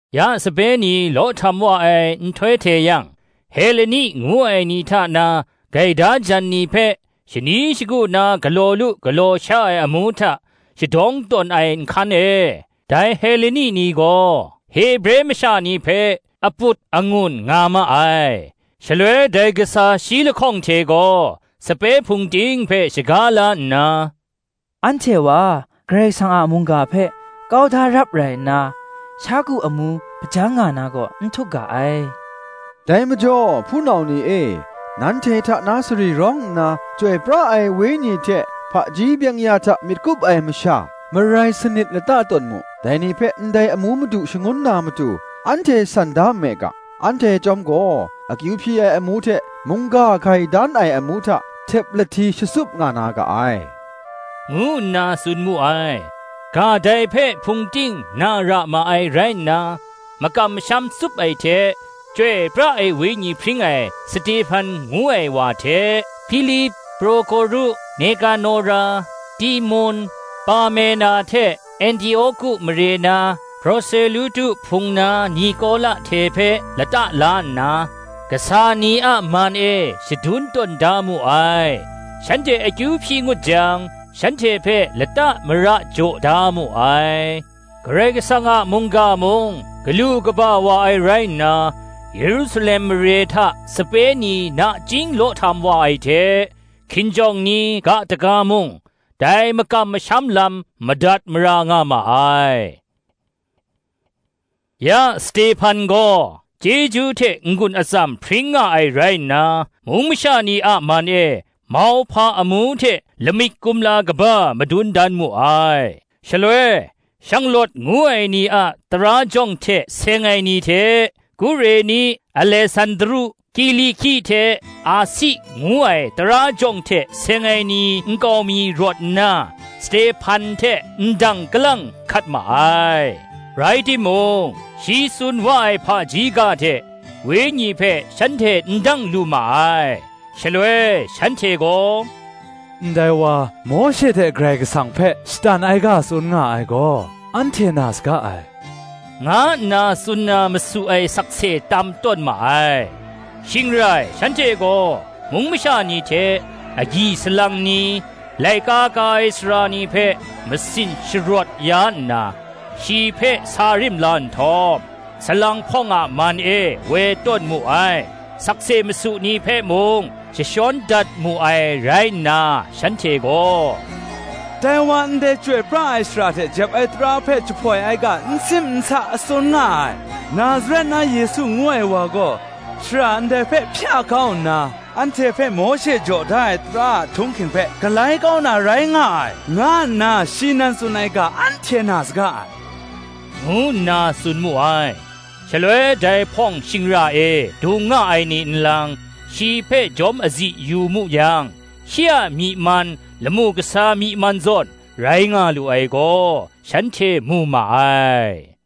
Ya, sape ni law htam wa ai nhtoi hte yang, Heleni ngu ai ni hta na gaida jan ni hpe, shani shagu na galaw lu galaw sha ai amu hta shadawng tawn ai nhkan e, dai Heleni ni gaw Hebre masha ni hpe, aput angun nga ma ai. Shaloi dai kasa shi lahkawng hte gaw sape hpung ting hpe shaga la nna, “Anhte wa Karai Kasang a mungga hpe kau da rap rai nna, sha ku amu hpajang nga na gaw, n htuk ga ai. Dai majaw, hpunau ni e, nanhte hta na sari rawng nna, Chyoi pra ai Wenyi hte hpaji byeng-ya hta myit kup ai masha marai sanit lata tawn mu; dai ni hpe ndai amu madu shangun na matu, anhte san da nme ga. Anhte chyawm gaw, akyu hpyi ai amu hte mungga hkai dan ai amu hta, htep lahti shatsup nga na ga ai,” ngu nna tsun mu ai. Ga dai hpe hpung ting na ra ma ai rai nna, makam masham tsup ai hte, Chyoi pra ai Wenyi hpring ai Stehpan ngu ai wa hte, Hpilip, Prokoru, Nekanora, Timun, Parmena hte Antioki mare na Proselutu hpung na Nikola hte hpe lata la nna, kasa ni a man e shadun tawn da mu ai; shanhte akyu hpyi ngut jang, shanhte hpe lata mara jaw da mu ai. Karai kasang a mungga mung, galu kaba wa ai rai nna, Yerusalem mare hta sape ni nachying law htam wa ai hte, hkinjawng ni ga daga mung, dai makam masham lam madat mara nga ma ai. Ya Stehpan gaw chyeju hte n-gun atsam hpring nga ai rai nna, mung masha ni a man e mauhpa amu hte lamik kumla kaba madun dan mu ai. Shaloi, Shanglawt ngu ai ni a tara jawng hte seng ai ni hte, Kureni, Alesandru, Kiliki hte Asi ngu ai tara jawng hte seng ai ni nkau mi rawt nna, Stehpan hte ndang kalang hkat ma ai. Rai timung, shi tsun wa ai hpaji ga hte Wenyi hpe shanhte n dang lu ma ai. Shaloi shanhte gaw, “Ndai wa Mawshe hte Karai Kasang hpe shatan ai ga tsun nga ai gaw, anhte na saga ai,” nga nna tsun na masu ai sakse tam tawn ma ai. Shing rai shanhte gaw mung masha ni hte, agyi salang ni, laika ka ai sara ni hpe masin sharawt ya nna, shi hpe sa rim la nhtawm, salang hpawng a man e woi tawn mu ai: sakse masu ni hpe mung jashawn dat mu ai rai nna, shanhte gaw, “Dai wa, ndai chyoi pra ai shara hte jep ai tara hpe jahpoi ai ga n sim n sa a tsun nga ai: Nazaret na Yesu ngu ai wa gaw, shara ndai hpe hpya kau nna, anhte hpe Mawshe jaw da ai tara a htung hking hpe galai kau na rai nga ai, nga nna shi nan tsun ai ga anhte na saga ai,” ngu nna tsun mu ai. Shaloi dai hpawng shingra e dung nga ai ni nlang, shi hpe jawm azi yu mu yang, shi a myi man lamu kasa myi man zawn rai nga lu ai gaw, shanhte mu ma ai.